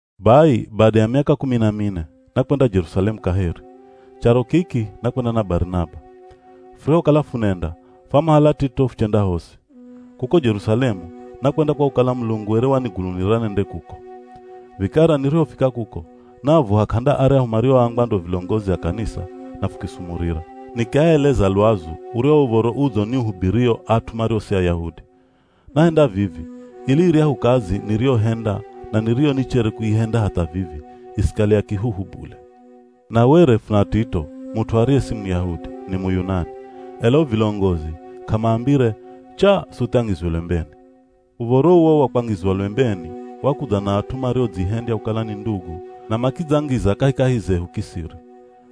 Bai bada ya miaka kumi na mine, nakwenda Jerusalemu kaheri. Charo kiki nakwenda na Barinaba. Furihokala funenda, fwamuhala Tito fuchenda hosi. Kuko Jerusalemu nakwenda kwa kukala Mulungu were wanigunulira nende kuko. Vikara nirihofika kuko, naavuha k'anda aryahu marioambwa ndo vilongozi a kanisa na fukisumurira. Nikiaeleza lwazu uryahu Uv̱oro Udzo niuhubirio at'u mario si Ayahudi. Nahenda vivi, ili iryahu kazi niriyohenda na niriyo nichere kuihenda hatha vivi, isikale ya kihuhu bule. Na were funa Tito, mut'u ariye si Muyahudi, ni Muyunani, ela o vilongozi k'amaambire, “Chaa suthi angizwe lwembeni.” Uv̱oro uwo wa kwangizwa lwembeni, wakudza na at'u mariodzihendya kukala ni ndugu na makidzangiza kahikahi zehu kisiri.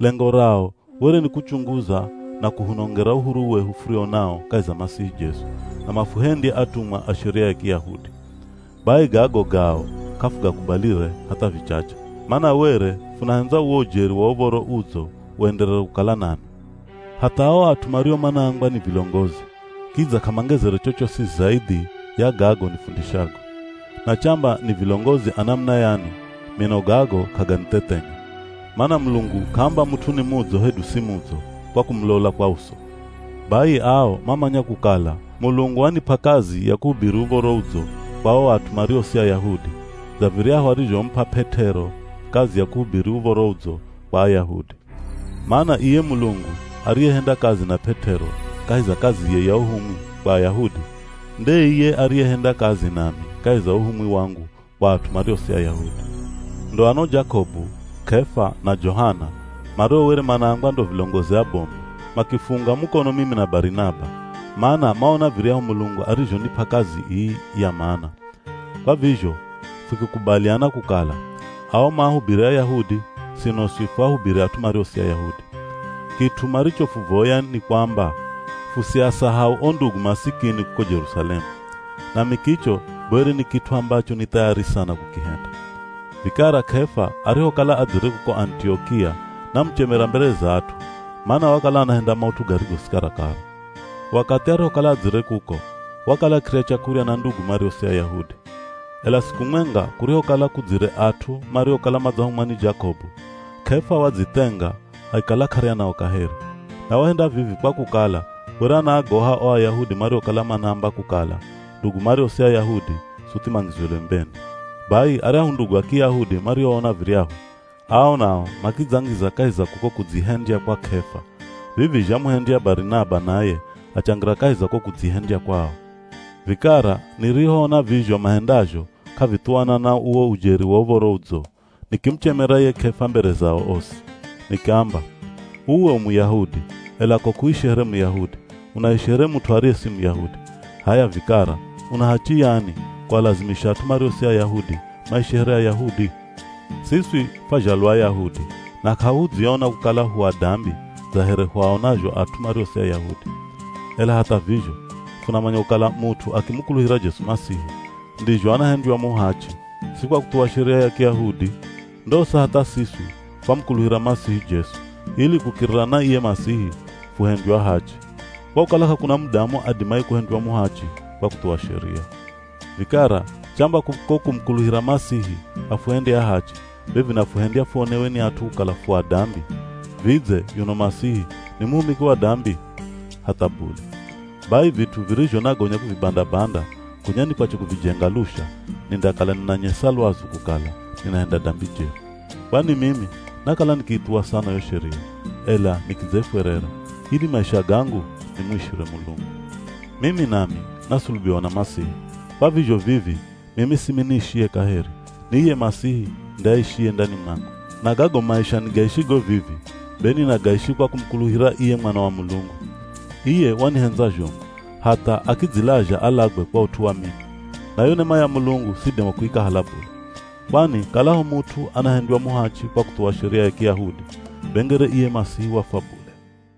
Lengo rao were ni kuchunguza na kuhunongera uhuru wehu furio nao kahi za Masihi Jesu, na mafuhendye atumwa a Sheria ya Kiyahudi. Bai gago gao k'afugakubalire hatha vichache, mana were funahendza uwo ujeri wa Uv̱oro Udzo uenderere kukala nanwi. Hatha ao at'u mario manaambwa ni vilongozi, kidza k'amangezere chochosi zaidhi ya gago nifundishago. Na chamba ni vilongozi a namuna yani, mino gago k'aganithethenya. Mana Mulungu k'aamba mut'u ni mudzo hedu si mudzo, kwa kumulola kwa uso. Bai ao mamanya kukala Mulungu wanip'a kazi ya kuhubiri Uv̱oro Udzo kwa o at'u mario si Ayahudi, dza viryahu arizhomup'a P'et'ero kazi ya kuhubiri Uv̱oro Udzo kwa Ayahudi. Mana iye Mulungu ariyehenda kazi na P'et'ero kahi za kaziye ya uhumwi kwa Ayahudi, nde iye ariyehenda kazi nami kahi za uhumwi wangu kwa at'u mario si Ayahudi. Ndo o ano Jakobu, K'efa, na Johana, mario were manaambwa ndo vilongozi abomu, makifuunga mukono mimi na Barinaba, mana maona viryahu Mulungu arizhonip'a kazi ii ya mana. Kwa vizho fukikubaliana kukala, ao maahubiri Ayahudi, sino swi fuahubiri at'u mario si Ayahudi. Kit'u marichofuvoya, ni kwamba fusiasahau o ndugu masikini kuko Jerusalemu. Nami kicho be were ni kit'u ambacho ni thayari sana kukihenda. Vikara K'efa arihokala adzire kuko Anitiokia, namuchemera mbere za at'u, mana wakala anahenda maut'u garigo si karakara. Wakathi arihokala adzire kuko, wakala akirya chakurya na ndugu mario si Ayahudi. Ela siku mwenga kurihokala kudzire at'u mariokala madzahumwa ni Jakobu, K'efa wadzithenga akikala k'arya nao kaheri. Na wahenda vivi kwa kukala were anaagoha o Ayahudi mariokala manaamba kukala ndugu mario si Ayahudi, suthi mangizwe lwembeni. Bai aryahu ndugu a Kiyahudi marihoona viryahu, ao nao makidzangiza kahi za kuko kudzihendya kwa K'efa, vivi zhamuhendya Barinaba naye achangira kahi za ko kudzihendya kwao. Vikara nirihoona vizho mahendazho k'avithuwana na uwo ujeri wa Uv̱oro Udzo, nikimuchemera ye K'efa mbere zao osi. Nikiamba, “Uwe u Muyahudi, ela ko k'uishi here Muyahudi, unaishi here mut'u ariye si Muyahudi. H'aya vikara una hachi yani, kualazimisha at'u mario si Ayahudi maishi here Ayahudi? Siswi fwazhalwa Ayahudi, na k'ahudziona kukala hu adambi dza here huaonazho at'u mario si Ayahudi. Ela hatha vizho, funamanya kukala mut'u akimukuluhira Jesu Masihi, ndizho anahendywa muhachi, si kwa kuthuwa Sheria ya Kiyahudi. Ndosa hatha siswi fwamukuluhira Masihi Jesu, ili kukirira na iye Masihi, fuhendywe ahachi. Kwa kukala k'akuna mudamu adimaye kuhendywa muhachi kwa kuthuwa Sheria. Vikara chamba kuko kumukuluhira Masihi afuhendye ahachi, be vinafuhendya fuonewe ni at'u kukala fu ‘adambi,’ vidze, yuno Masihi ni muhumiki wa dambi? Hatha bule! Bai vit'u virizho nagonya kuvibanda-banda, gonya nikwache kuvijenga lusha, nindakala ninanyesa lwazu kukala, ninahenda dambi jeri. Kwani mimi nakala nikiithuwa sana yo Sheria, ela nikidzaifwerera, ili maisha gangu nimuishire Mulungu. Mimi nami nasulubiwa na Masihi, kwa vizho vivi mimi simi niishiye kaheri, ni iye Masihi nde aishiye ndani mwangu. Na gago maisha nigaishigo vivi, be ninagaishi kwa kumukuluhira iye Mwana wa Mulungu. Iye wanihendza zhomu, hatha akidzilazha alagwe kwa ut'u wa mimi. Na yo nema ya Mulungu sidima kuikahala bule. Kwani kalaho mut'u anahendywa muhachi kwa kuthuwa Sheria ya Kiyahudi, be ngere iye Masihi wafwa bule.”